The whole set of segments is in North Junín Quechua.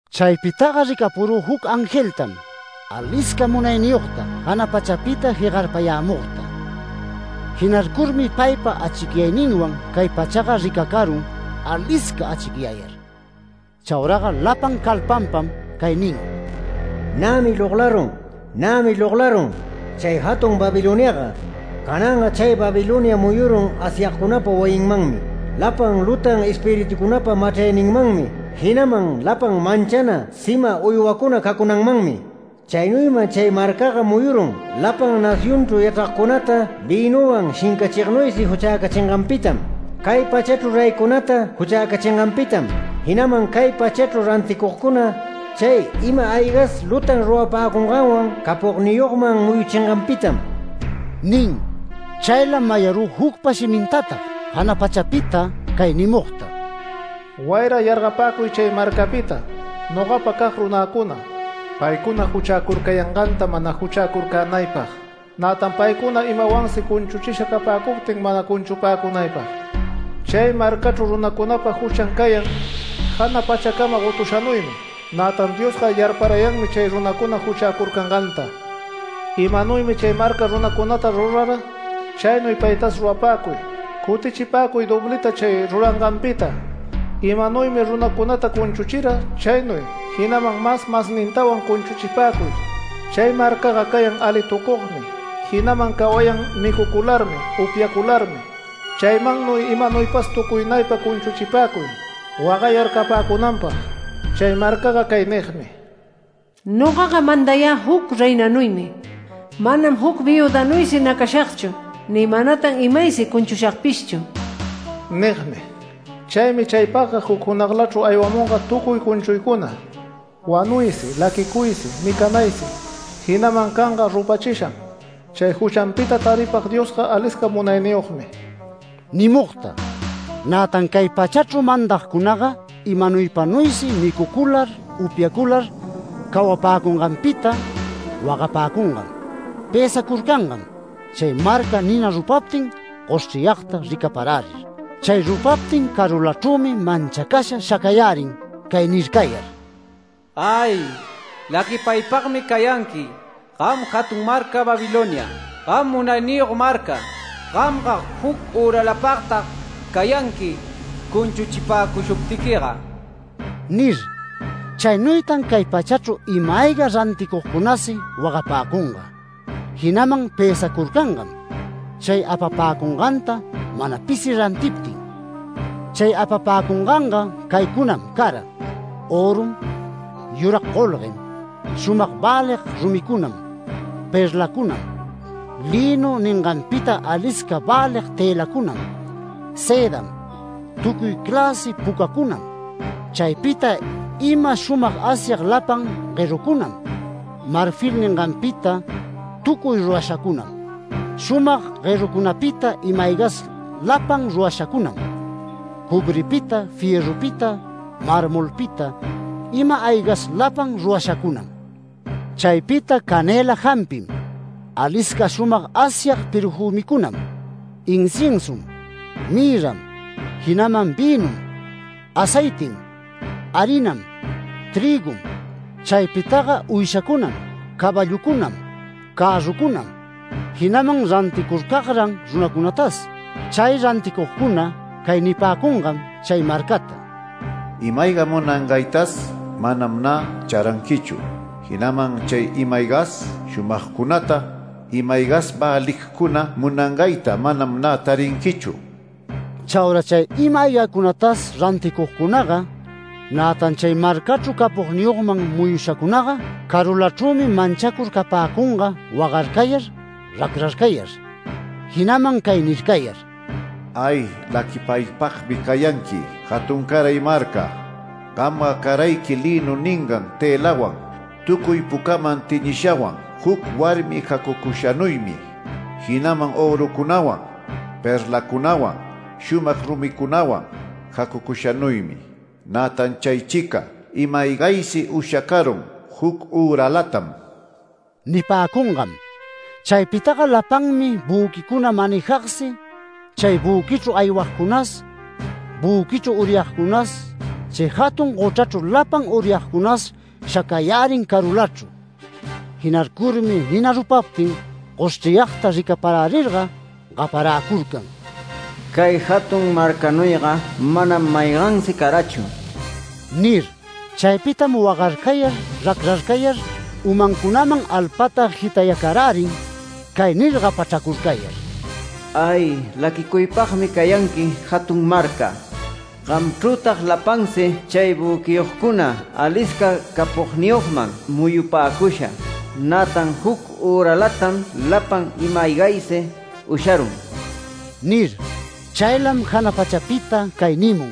Chaypitaga ricapurü juc angeltam, alisca munayniyogta, jana pachapita jegarpayämugta. Jinarcurmi paypa achicyayninwan cay pachaga ricacarun alisca achicyayar. Chauraga lapan calpanpam cay nin: “Nämi loglarun, nämi loglarun, chay jatun Babiloniaga. Cananga chay Babilonia muyurun Asyagcunapa wayinmanmi, lapan lutan espiritucunapa machrayninmanmi, jinaman lapan manchana sima uywacuna cacunanmanmi. Chaynuyman chay marcaga muyurun, lapan nacionchru yachragcunata vïnunwan shincachignuysi juchäcachinganpitam. Cay pachachru reycunata juchäcachinganpitam, jinaman cay pachachru ranticugcuna, chay ima-aygas lutan rurapäcunganwan capogniyogman muyuchinganpitam” nin. Chaylam mayarü jucpa shimintatag jana pachapita cay nimugta: “Wayra yargapäcuy chay marcapita nogapacag runäcuna, paycuna juchäcurcayanganta mana juchäcurcänaypag, nätan paycuna imawansi cunchuchisha capäcuptin mana cunchupäcunaypag. Chay marcachru runacunapa juchan cayan, jana pachacama gotushanuymi, nätan Diosga yarparayanmi chay runacuna juchäcurcanganta. Imanuymi chay marca runacunata rurara chaynuy paytas rurapäcuy. Cutichipäcuy dobliyta chay ruranganpita, imanuymi runacunata cunchuchira chaynuy, jinaman mas masnintawan cunchuchipäcuy. Chay marcaga cayan alitucugmi, jinaman cawayan micucularmi, upyacularmi. Chaymannuy imanuypas tucuynaypa cunchuchipäcuy, wagayar capäcunanpag. Chay marcaga cay nigmi: ‘Nogaga mandayä juc reinanuymi. Manam juc viüdanuysi nacashagchu ni manatan imaysi cunchushagpishchu’ nigmi. Chaymi chaypagga juc junaglachru aywamunga tucuy cunchuycuna, wanuysi laquicuysi micanaysi, jinaman canga rupachisham. Chay juchanpita taripag Diosga alisca munayniyogmi” nimugta. Nätan cay pachachru mandagcunaga, imanuypanuysi micucular upyacular cawapäcunganpita, wagapäcungam, pësacurcangam, chay marcata nina rupaptin goshchriyagta ricaparärir. Chay rupaptin carulachrümi manchacasha shacayärin cay nircayar: “¡Ay! laquipaypagmi cayanqui gam jatun marca Babilonia, gam munayniyog marca, gamga juc üralapagtag cayänayqui cunchuchipäcushuptiquiga” nir. Chaynuytan cay pachachru ima-ayga ranticugcunasi wagapäcunga, jinaman pësacurcangam chay apapäcunganta mana pisi rantiptin. Chay apapäcunganga caycunam cara: Örum, yurag golguem, shumag välig rumicunam, perlacunam, lïnu ninganpita alisca välig tëlacunam, sëdam, tucuy cläsi pucacunam. Chaypita ima shumag asyag lapan guerucunam, marfil ninganpita tucuy rurashacunam, shumag guerucunapita ima-aygas lapan rurashacunam, cobripita, fierrupita, marmolpita ima-aygas lapan rurashacunam. Chaypita canëla jampim, alisca shumag asyag perfümicunam, inciensum, mirram, jinaman vïnum, aceitim, harinam, trïgum. Chaypitaga uyshacunam, caballucunam, cärrucunam, jinaman ranticurcagran runacunatas. Chay ranticugcuna cay nipäcungam chay marcata: “Ima-ayga munangaytas manam nä charanquichu, jinaman chay ima-aygas shumagcunata, ima-aygas väligcuna munangayta manam nä tarinquichu”. Chaura chay ima-aygacunatas ranticugcunaga, nätan chay marcachru capogniyogman muyushacunaga carulachrümi manchacur capäcunga wagarcayar racrarcayar. Jinaman cay nircayar “¡Ay! ¡Laquipaypagmi cayanqui jatuncaray marca! Gamga carayqui lïnu ningan tëlawan, tucuy pucaman teñishawan juc warmi jacucushanuymi, jinaman örucunawan, perlacunawan, shumag rumicunawan jacucushanuymi. Nätan chaychica ima-aygaysi ushacarun juc üralatam” nipäcungam. Chaypitaga lapanmi büquicuna manejagsi, chay büquichru aywagcunas, büquichru uryagcunas, chay jatun gochrachru lapan uryagcunas shacayärin carulachru. Jinarcurmi nina rupaptin goshchriyagta ricaparärirga gaparäcurcan: “Cay jatun marcanuyga manam maygansi carachu” nir. Chaypitam wagarcayar racrarcayar umancunaman alpata jitayacarärin cay nir gapachracurcayar: “¡Ay! ¡Laquicuypagmi cayanqui jatun marca! Gamchrütag lapansi chay büquiyogcuna alisca capogniyogman muyupäcusha, nätan juc üralatam lapan ima-aygaysi usharun” nir. Chaylam jana pachapita cay nimun: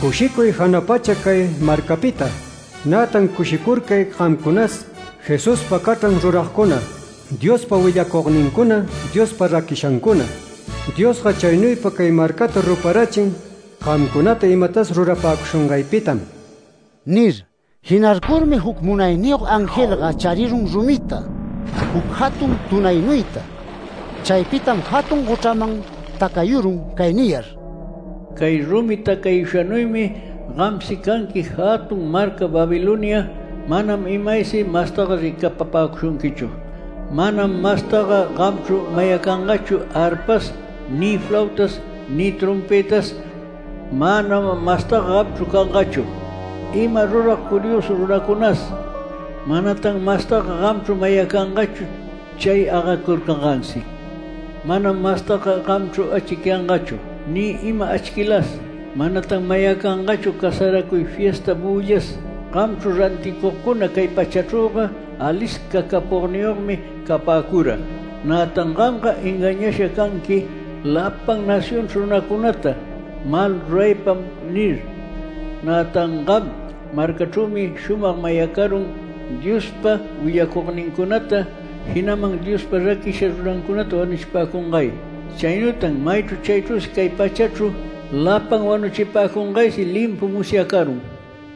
“¡Cushicuy jana pacha cay marcapita! Nätan ¡cushicurcay gamcunas, Jesuspa cachran ruragcuna, Diospa willacugnincuna, Diospa raquishancuna! Diosga chaynuypa cay marcata ruparachin gamcunata imatas rurapäcushungaypitam” nir. Jinarcurmi juc munayniyog angelga charirun rumita, juc jatun tunaynuyta. Chaypitam jatun gochraman tacayurun cay niyar: “Cay rumi tacayushanuymi gamsi canqui jatun marca Babilonia. Manam imaysi mastaga ricapapäcushunquichu. Manam mastaga gamchru mayacangachu arpas, ni flautas, ni trompëtas. Manam mastaga gamchru cangachu ima rurag curiosu runacunas. Manatan mastaga gamchru mayacangachu chay agacurcangansi. Manam mastaga gamchru achicyangachu ni ima achquiylas. Manatan mayacangachu casaracuy fiesta büllas. Gamchru ranticugcuna cay pachachrüga alisca capogniyogmi capäcura. Nätan ‘Gamga engañasha canqui lapan nacionchru runacunata, mal ruraypam’ nir. Nätan gam marcachrümi shumag mayacarun Diospa willacugnincunata, jinaman Diospa raquisha runancunata wanuchipäcungay. Chaynuytan maychru chaychru cay pachachru lapan wanuchipäcungaysi limpu musyacarun” niyar.